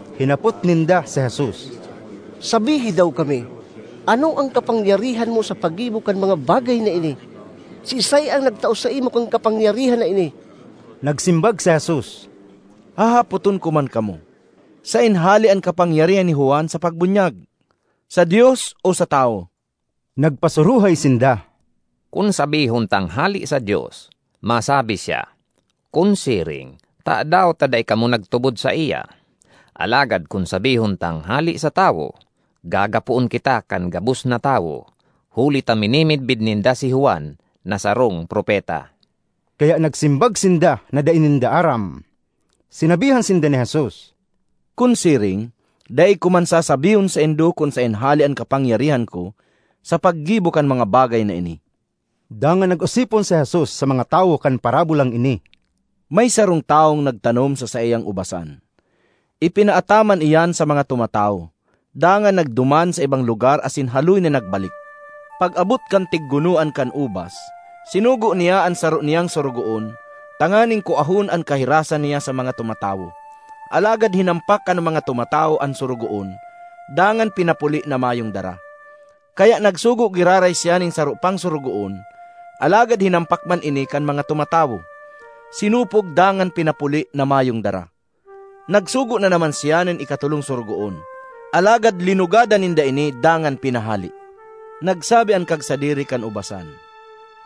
Hinapot ninda si Jesus, “Sabihi daw kami, ano an kapangyarihan mo sa paggibo kan mga bagay na ini? Siisay an nagtao saimo kan kapangyarihan na ini?” Nagsimbag si Jesus, “Hahapoton ko man kamo: saen hale an kapangyarihan ni Juan sa pagbunyag, sa Dios o sa tawo?” Nagpasuruhay sinda, “Kun sabihon tang, ‘Hale sa Dios,’ masabi siya, ‘kun siring tadaw ta dai kamo nagtubod saiya?’ Alagad kun sabihon tang, ‘Hale sa tawo,’ gagapoon kita kan gabos na tawo huli ta minimidbid ninda si Juan na sarong propeta.” Kaya nagsimbag sinda na dai ninda aram. Sinabihan sinda ni Jesus, “Kun siring, dai ko man sasabihon saindo kun saen hale an kapangyarihan ko sa paggibo kan mga bagay na ini.” Dangan nag-osipon si Jesus sa mga tawo kan parabolang ini, “May sarong tawong nagtanom sa saiyang ubasan, ipinaataman iyan sa mga tumatawo, dangan nagduman sa ibang lugar asin haloy na nagbalik. Pag-abot kan tiggunoan kan ubas, sinugo niya an saro niyang sorogoon tanganing kuahon an kahirasan niya sa mga tumatawo. Alagad hinampak kan mga tumatawo an sorogoon dangan pinapuli na mayong dara. Kaya nagsugo giraray siya nin saro pang sorogoon, alagad hinampak man ini kan mga tumatawo, sinupog dangan pinapuli na mayong dara. Nagsugo na naman siya nin ikatolong sorogoon, alagad linugadan ninda ini dangan pinahale. Nagsabi an kagsadiri kan ubasan,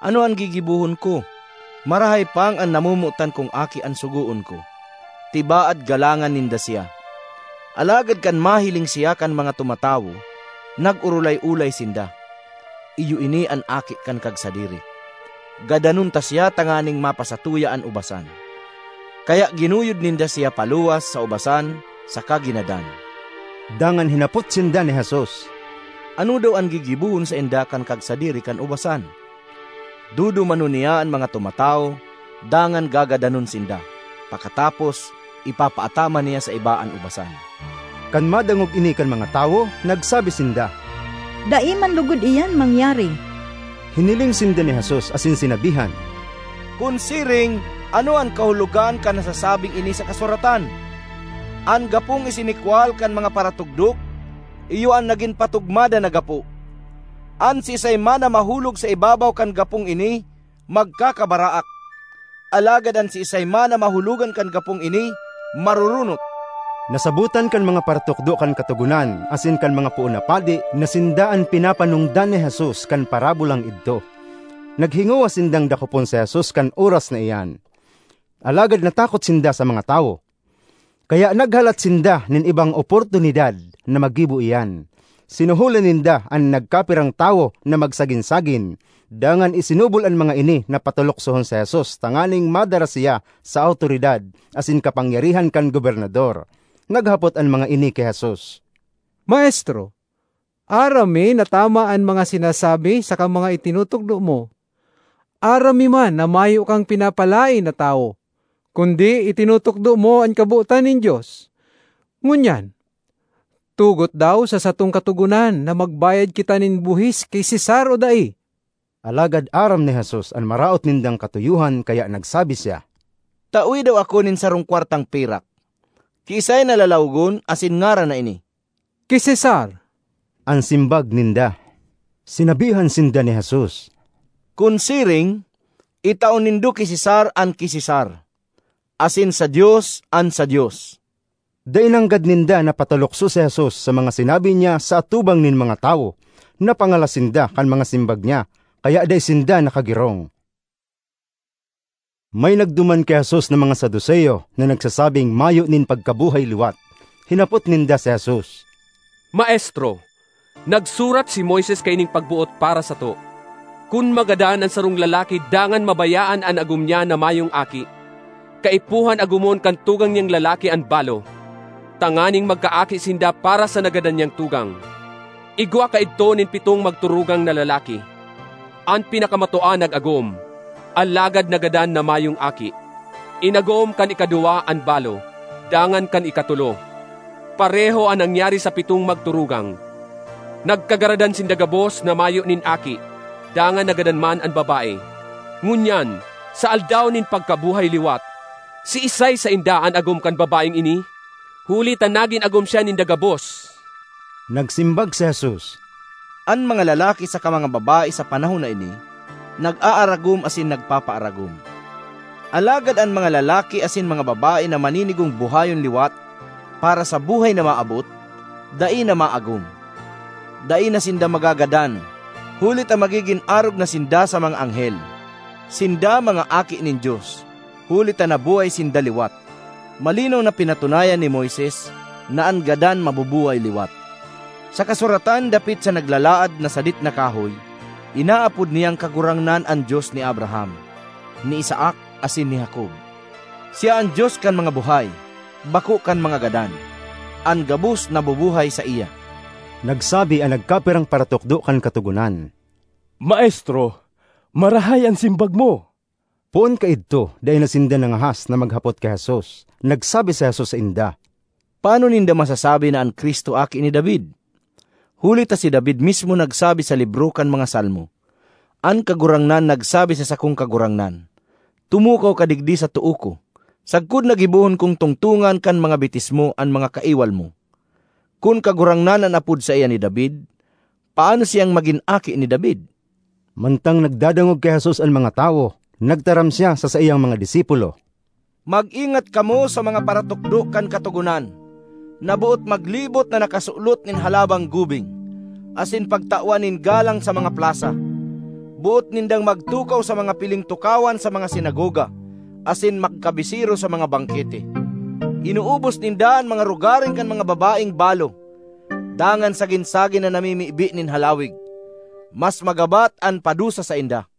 ‘Ano an gigibohon ko? Marahay pang an namomotan kong aki an sugoon ko; tibaad galangan ninda siya!’ Alagad kan mahiling siya kan mga tumatawo, nag-orolay-olay sinda, ‘Iyo ini an aki kan kagsadiri. Gadanon ta siya tanganing mapasatuya an ubasan!’ Kaya ginuyod ninda siya paluwas sa ubasan saka ginadan.” Dangan hinapot sinda ni Jesus, “Ano daw an gigibohon sainda kan kagsadiri kan ubasan? Dudumanon niya an mga tumatawo dangan gagadanon sinda; pakatapos, ipapaataman niya sa iba an ubasan.” Kan madangog ini kan mga tawo, nagsabi sinda, “Dai man logod iyan mangyari!” Hiniling sinda ni Jesus asin sinabihan, “Kun siring, ano an kahulogan kan nasasabing ini sa kasuratan? ‘An gapong isinikwal kan mga paratugdok iyo an nagin patugmadan na gapo.’ An siisay man na mahulog sa ibabaw kan gapong ini magkakabaraak; alagad an siisay man na mahulogan kan gapong ini maroronot.” Nasabotan kan mga paratukdo kan Katogonan asin kan mga poon na padi na sinda an pinapanongdan ni Jesus kan parabolang idto. Naghingowa sindang dakopon si Jesus kan oras na iyan, alagad natakot sinda sa mga tawo. Kaya naghalat sinda nin ibang oportunidad na magibo iyan. Sinuholan ninda an nagkapirang tawo na magsagin-sagin, dangan isinubol an mga ini na pataluksohon si Jesus tanganing madara siya sa awtoridad asin kapangyarihan kan gobernador. Naghapot an mga ini ki Jesus, “Maestro, aram mi na tama an mga sinasabi saka mga itinutukdo mo. Aram mi man na mayo kang pinapalaen na tawo, kundi itinutukdo mo an kabotan nin Dios. Ngunyan, tugot daw sa satong Katogonan na magbayad kita nin buhis ki Cesar o dai?” Alagad aram ni Jesus an maraot nindang katuyohan kaya nagsabi siya, ”Tawe daw ako nin sarong kwartang pirak. Kiisay na lalawogon asin ngaran na ini?” “Ki Cesar,” an simbag ninda. Sinabihan sinda ni Jesus, “Kun siring, itao nindo ki Cesar an ki Cesar, asin sa Dios an sa Dios.” Dai nanggad ninda napatalukso si Jesus sa mga sinabi niya sa atubang nin mga tawo. Napangalas sinda kan mga simbag niya, kaya dai sinda nakagirong. May nagduman ki Jesus na mga Saduceo, na nagsasabing mayo nin pagkabuhay-liwat. Hinapot ninda si Jesus, ”Maestro, nagsurat si Moises kaining pagboot para sato, ‘Kun magadan an sarong lalaki dangan mabayaan an agom niya na mayong aki, kaipuhan agomon kan tugang niyang lalaki an balo, tanganing magkaaki sinda para sa nagadan niyang tugang.’ Igwa kaidto nin pitong magturugang na lalaki. An pinakamatua nag-agom, alagad nagadan na mayong aki. Inagom kan ikaduwa an balo, dangan kan ikatolo. Pareho an nangyari sa pitong magturugang; nagkagaradan sinda gabos na mayo nin aki. Dangan nagadan man an babae. Ngunyan, sa aldaw nin pagkabuhay-liwat, siisay sainda an agom kan babaeng ini? Huli ta nagin agom siya ninda gabos!” Nagsimbag si Jesus, “An mga lalaki saka mga babae sa panahon na ini nag-aaragom asin nagpapaaragom, alagad an mga lalaki asin mga babae na maninigong buhayon liwat para sa buhay na maabot, dai na maagom. Dai na sinda magagadan, huli ta magigin arog na sinda sa mga anghel. Sinda mga aki nin Dios, huli ta nabuhay sinda liwat. Malinaw na pinatunayan ni Moises na an gadan mabubuhay liwat. Sa kasuratan dapit sa naglalaad na sadit na kahoy, inaapod niyang Kagurangnan an Dios ni Abraham, ni Isaac, asin ni Jacob. Siya an Dios kan mga buhay, bako kan mga gadan—an gabos nabubuhay saiya.” Nagsabi an nagkapirang paratukdo kan Katogonan, “Maestro, marahay an simbag mo!” Poon kaidto dai na sinda nangahas na maghapot ki Jesus. Nagsabi si Jesus sainda, “Paano ninda masasabi na an Cristo aki ni David? Huli ta si David mismo nagsabi sa libro kan mga Salmo, ‘An Kagurangnan nagsabi sa sakong Kagurangnan: Tumukaw ka digdi sa too ko, sagkod na gibohon kong tungtongan kan mga bitis mo an mga kaiwal mo.’ Kun ‘Kagurangnan’ an apod saiya ni David, paano siyang magin aki ni David?” Mantang nagdadangog ki Jesus an mga tawo, nagtaram siya sa saiyang mga disipulo, ”Mag-ingat kamo sa mga paratukdo kan Katogonan, na boot maglibot na nakasulot nin halabang gubing, asin pagtawan nin galang sa mga plasa; boot nindang magtukaw sa mga piling tukawan sa mga sinagoga asin magkabisero sa mga bangkete. Inuubos ninda an mga rogaring kan mga babaeng balo, dangan sagin-sagin na namimibi nin halawig. Mas magabat an padusa sainda!”